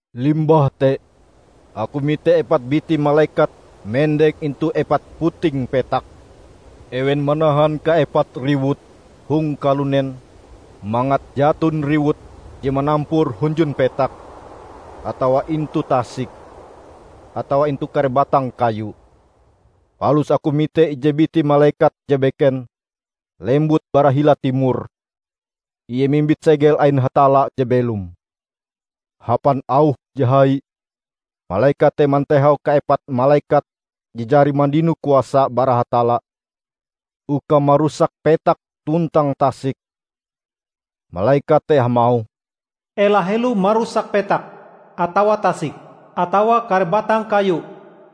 Limbah te, aku mite epat biti malekat mendeng intu epat puting petak. Ewen manahan kaepat riwut hong kalunen mangat jaton riwut je manampur hunjun petak atawa intu tasik, atawa intu kare batang kayu. Palus aku mite ije biti malekat je beken lembut bara hila timor. Ie mimbit segel ain Hatalla je belom. Hapan auh je hai malekat te matehau kaepat malekat je jari mandino kuasa bara Hatalla uka marusak petak tuntang tasik. Malekat te hamauh, "Ela helo marusak petak atawa tasik, atawa kare batang kayu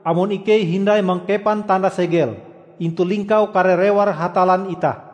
amon ikei hindai mangkepan tanda segel intu lingkau kare rewar Hatallan itah."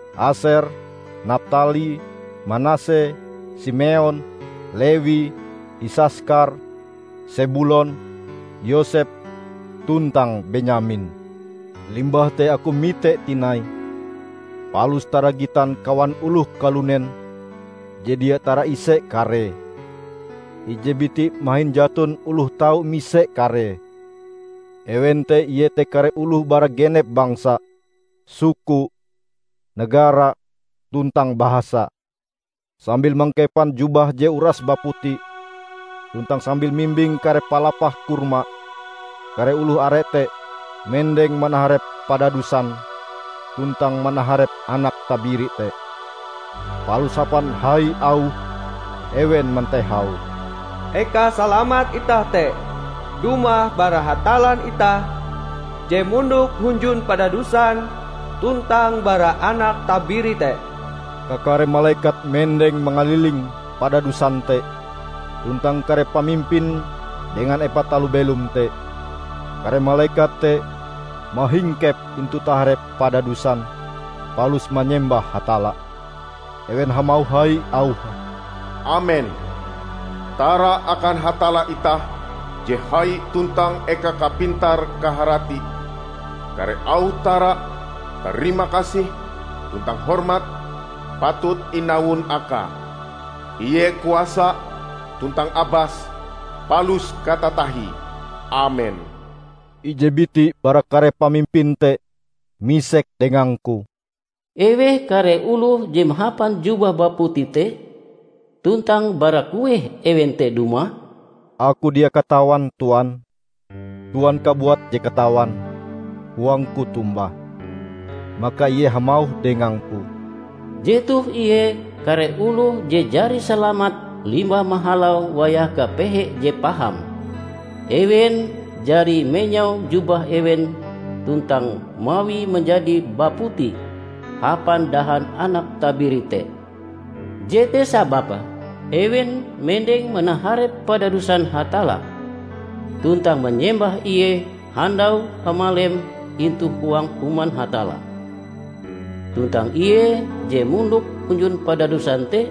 Aser, Naptali, Manase, Simeon, Lewi, Isaskar, Sebulon, Yosep, tuntang Benyamin. Limbah te aku mite tinai, palus taragitan kawan oloh kalunen je dia taraise karee -- ije biti mahin jaton oloh tau mise karee. Ewen te iete kare oloh bara genep bangsa, suku, negara, tuntang bahasa. Sambil mangkepan jubah je uras baputi tuntang sambil mimbing kare palapah korma, kare oloh are te mendeng manaharep padadusan tuntang manaharep Anak Tabiri te. Palus hapan hai auh ewen mantehau, "Eka salamat itah te dumah bara Hatallan itah, je mondok hunjun padadusan tuntang bara Anak Tabiri te!" Kakare malekat mendeng mangaliling padadusan te tuntang kare pamimpin dengan epat taloh belom te. Kare malekat te mahingkep intu taharep padadusan palus manyembah Hatalla. Ewen hamauh hai auhe, "Amen! Tara akan Hatallan itah je hai tuntang eka kapintar-kaharati. Kare auh tara, tarimakasih tuntang hormat patut inawon akae. Ie kuasa tuntang abas palus katatahie! Amen." Ije biti bara kare pamimpin te misek dengangku, "Eweh kare oloh je mahapan jubah baputi te, tuntang bara kueh ewen te dumah?" "Aku dia katawan, Tuan. Tuan kabuat je katawan," koangku tombah. Maka ie hamauh dengangku, "Jetoh ie kare oloh je jari salamat limbah mahalau wayah kapehe je paham. Ewen jari menyau jubah ewen tuntang mawie manjadi baputi hapan dahan Anak Tabiri te. Jete sababe ewen mendeng manaharep padadusan Hatalla, tuntang manyembah Ie handau hamalem intu huang Human Hatalla. Tuntang Ie je mondok hunjun padadusan te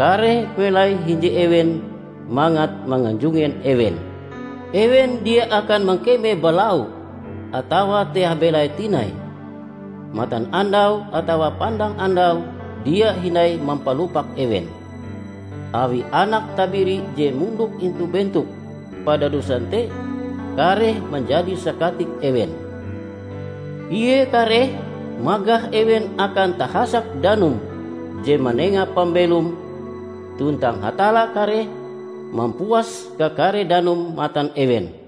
kareh melai hinje ewen mangat manganjungen ewen. Ewen dia akan mangkeme balau, atawa teah belai tinai; matanandau atawa pandang andau dia hindai mampalupak ewen, awi Anak Tabiri je mondok intu bentok padadusan te kareh manjadi sakatik ewen. Ie kareh magah ewen akan tahasak danum je manenga pambelom. Tuntang Hatalla kareh mampuas kakare danum matan ewen."